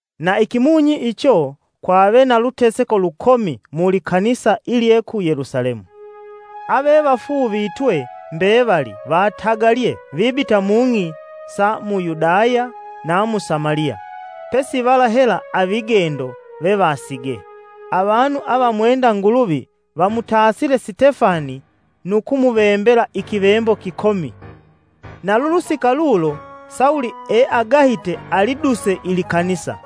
Na ikimunyi icho kwave na luteseko lukomi mu likanisa ilye ku Yelusalemu. Avevafuuvitwe mbevali, vatagalye vibita mung'i sa mu Yudaya na mu Samaliya, pesi vala hela avigendo vevasigee. Avanu avamwenda Nguluvi vamutasile Sitefani nu kumuvembela ikivembo kikomi. Na lulusika lulo, Sawulo eagahite aliduse ilikanisa.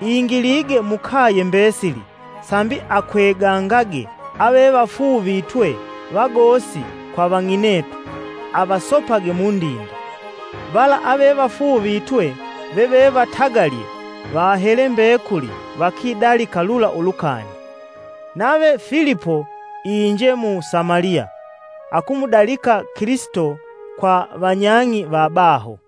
Ingilige mukaye mbesili, sambi akwegangage avevafuuvitwe vagosi kwa vang'inetu, avasopage mundinde. Vala avevafuuvitwe vevevatagalye, vahele mbekuli vakidalika lula ulukani. Nave Filipo inje mu Samaliya akumudalika Kilisito kwa vanyang'i vabaho.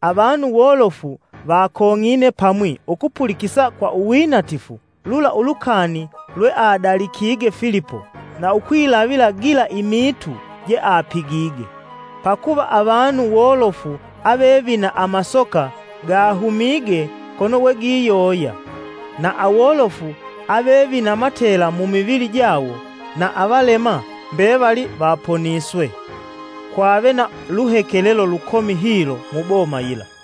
Avanu wolofu vakong'ine pamwi ukupulikisa kwa uwinatifu lula ulukani lweadalikige Filipo na ukwilavila gila imiitu jeapigige. Pakuva avanu wolofu ave vina amasoka, gahumige kono we giyoya. Na awolofu ave vina matela mumivili jawo na avalema mbevali vaponiswe. Kwave na luhekelelo lukomi hilo muboma yila.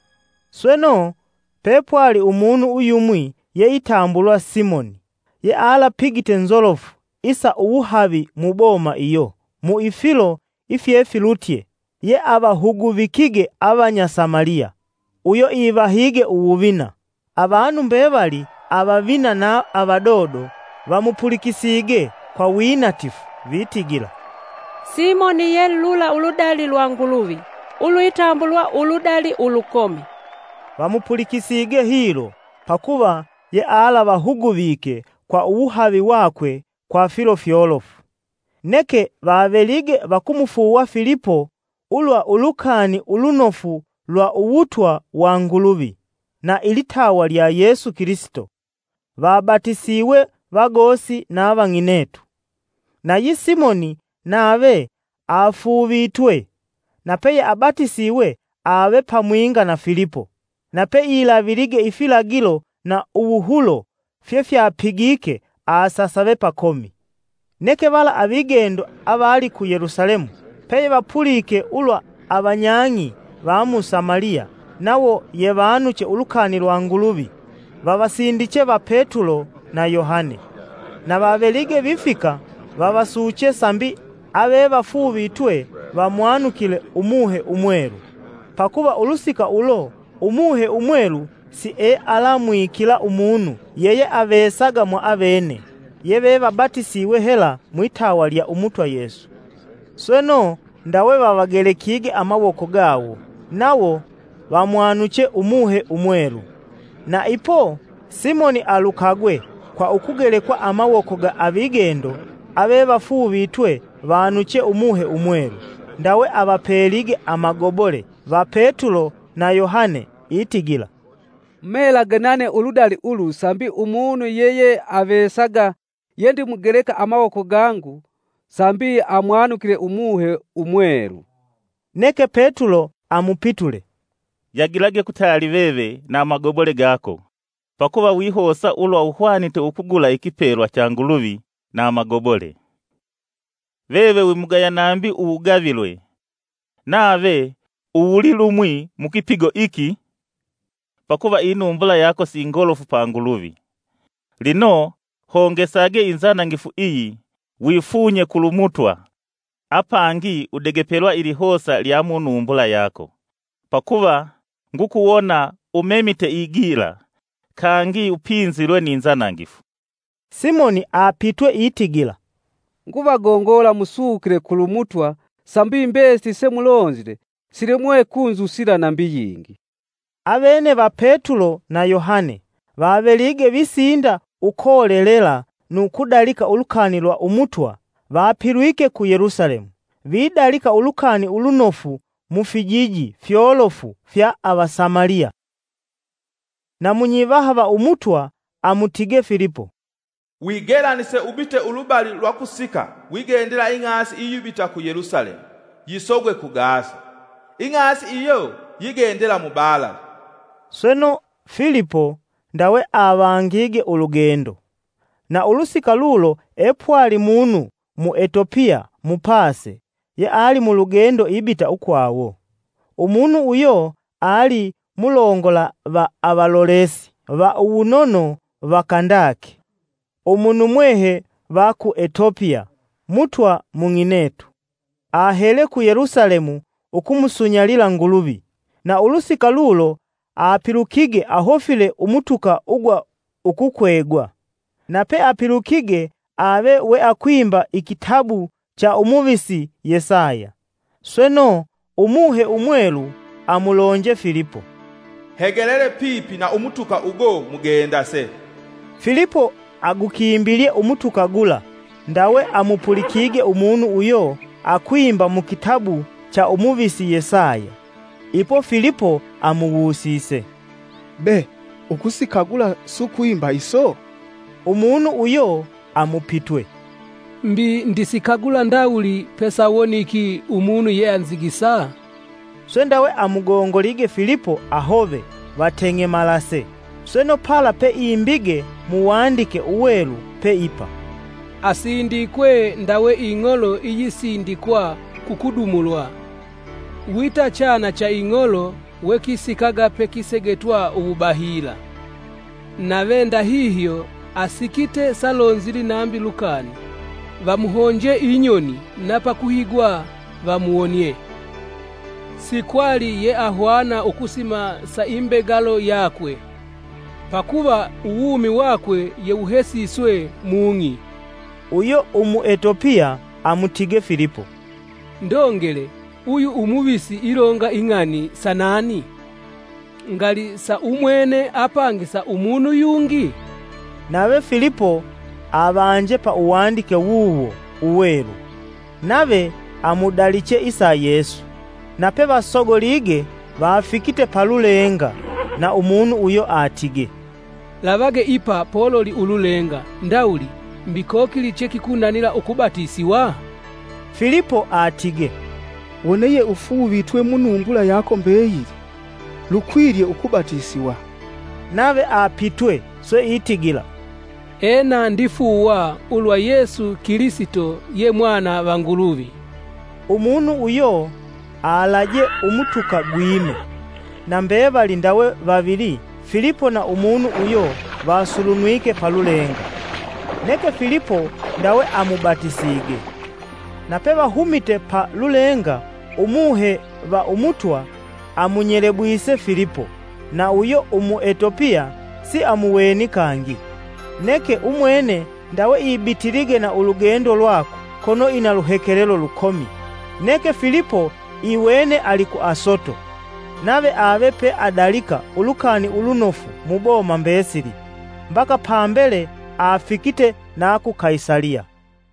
Sweno, pepwali umunu uyumwi yeitambulwa Simoni yealapigite nzolofu isa uwuhavi muboma iyo kwa ifilo ifyefilutye yeavahuguvikige avanya Samaliya, uyo ivahige uwuvina. Avanu mbevali, avavina na avadodo, vamupulikisige kwa winatifu vitigila, “Simoni ye lula uludali lwa Nguluvi ulwitambulwa ‘Uludali ulukomi.’” Vamupulikisige hilo pakuva yealavahuguvike kwa uwuhavi wakwe kwa filo fyolofu. Neke vavelige vakumufuuwa Filipo ulwa ulukani ulunofu lwa uwutwa wa Nguluvi, na ilitawa lya Yesu Kilisito, vabatisiwe vagosi na vang'inetu. Nayi Simoni nave afuuvitwe; na peyeabatisiwe ave pamwinga na Filipo, na peilavilige ifilagilo na uwuhulo fyefyapigike asasave pakomi. Neke vala avigendo avali ku Yelusalemu peyevapulike ulwa avanyang'i vamu Samaliya nawo yevanuche ulukani lwa Nguluvi; vavasindiche va Petulo na Yohane. Na vavelige vifika vavasuche sambi avevafuuvitwe vamwanukile Umuhe Umwelu, pakuva ulusika ulo Umuhe Umwelu siealamwikila umunu yeyeavesaga mwaavene, yevevabatisiwe hela mwitawa lya Umutwa Yesu. Sweno, ndawe vavagelekige amawoko gawo nawo vamwanuche Umuhe Umwelu. Na ipo Simoni alukagwe kwa ukugelekwa amawoko ga avigendo avevafuuvitwe vanuche Umuhe Umwelu ndawe avapelige amagobole va Petulo na Yohane itigila, “Mumelage nane uludali ulu sambi umunu yeyeavesaga yendimugeleka amawoko gangu, sambi amwanukile Umuhe Umwelu.” Neke Petulo amupitule, “Yagilage kutali veve na amagobole gako pakuva wihosa ulwa uhwanite ukugula ikipelwa cha Nguluvi na amagobole! Veve wimugaya nambi kigawo nave uwulilumwi mukipigo iki pakuva inumbula yako si ngolofu pa Nguluvi. Lino, hongesage inzanangifu iyi wifunye kulu Mutwa, apangi udegepelwa ilihosa lya munumbula yako. Pakuva ngukuwona umemite igila, kangi upinzilwe ni nzanangifu!” Simoni apitwe itigila, “Nguvagongola musukile kulu Mutwa sambi mbesili semulonzile silemwe ukunzusila nambi yingi.” Avene va Petulo na Yohane vavelige visinda ukolelela nu kudalika ulukani lwa Umutwa, vapilwike ku Yelusalemu, vidalika ulukani ulunofu mu fijiji fyolofu fya ava Samaliya. Na munyivaha va Umutwa amutige Filipo, “Wigelanise ubite ulubali lwa kusika wigendela ing'asi iyihuma ku Yelusalemu yisogwe ku Gasa.” (Ing'asi iyo yigendela mubalali.) Sweno, Filipo ndawe avangige ulugendo. Na ulusika lulo epwali munu Muetopiya, mupase, yeali mulugendo ibita ukwawo. Umunu uyo ali mulongola va avalolesi va uwunono va Kandake, umunumwehe va ku Etopiya. (Mutwa mung'inetu) Ahele ku Yelusalemu ukumusunyalila Nguluvi, na ulusika lulo apilukige ahofile umutuka ugwa ukukwegwa. Na peapilukige ave weakwimba ikitabu cha Umuvisi Yesaya. Sweno, Umuhe Umwelu amulonje Filipo, “Hegelele pipi na umutuka ugo mugendase.” Filipo agukimbilye umutuka gula ndawe amupulikige umunu uyo akwimba mukitabu cha Umuvisi Yesaya. Ipo Filipo amuwusise, “Be usikagula sukwimba iso?” Umunu uyo amupitwe, “Mbi ndisikagula ndawuli pesawoniki umunu yeanzigisa?” Swe ndawe amugongolige Filipo ahove vateng'emalase. Sweno pala peimbige mu wandike uwelu pe ipa, “Asindikwe ndawe ing'olo iyisindikwa kukudumulwa, wita chana cha ing'olo wekisikaga pekisegetwa uwubahila. Nave ndahihyo asikite salonzili nambi lukani. Vamuhonje inyoni na pakuhigwa vamuwonie. Sikwali yeahwana ukusima sa imbegalo yakwe, pakuva uwumi wakwe yewuhesiswe mung'i.” Uyo Umwetopiya amutige Filipo, “Ndongele uyu umuvisi ilonga ing'ani sa nani? Ngali sa umwene apangi sa umunu yungi?” Nave Filipo avanje pa uwandike wuwo uwelu, nave amudaliche isa Yesu. Nape vasogolige, vafikite pa lulenga na umunu uyo atige, “Lavage ipa pololi ululenga ndawuli mbi kokili che kikunanila ukubatisiwa?” ( Filipo atige, “Wone yeufuuvitwe mu numbula yako mbeyili, lukwilye ukubatisiwa.” Nave apitwe swe itigila, “Ena ndifuuwa ulwa Yesu Kilisito ye Mwana va Nguluvi”) Umunu uyo alaje umutuka gwime. Na mbevali ndawe vavili, Filipo na umunu uyo vasulunwike pa lulenga. Neke Filipo ndawe amubatisige. Na pevahumite pa lulenga, Umuhe va Umutwa amunyelebwise Filipo, na uyo Umwetopiya siamuweni kangi: neke umwene ndawe ibitilige na ulugendo lwakwe kono ina luhekelelo lukomi Neke Filipo iwene ali ku Asoto. Nave ave peadalika Ulukani Ulunofu muboma mbesili, mbaka pambele afikite na ku Kaisaliya.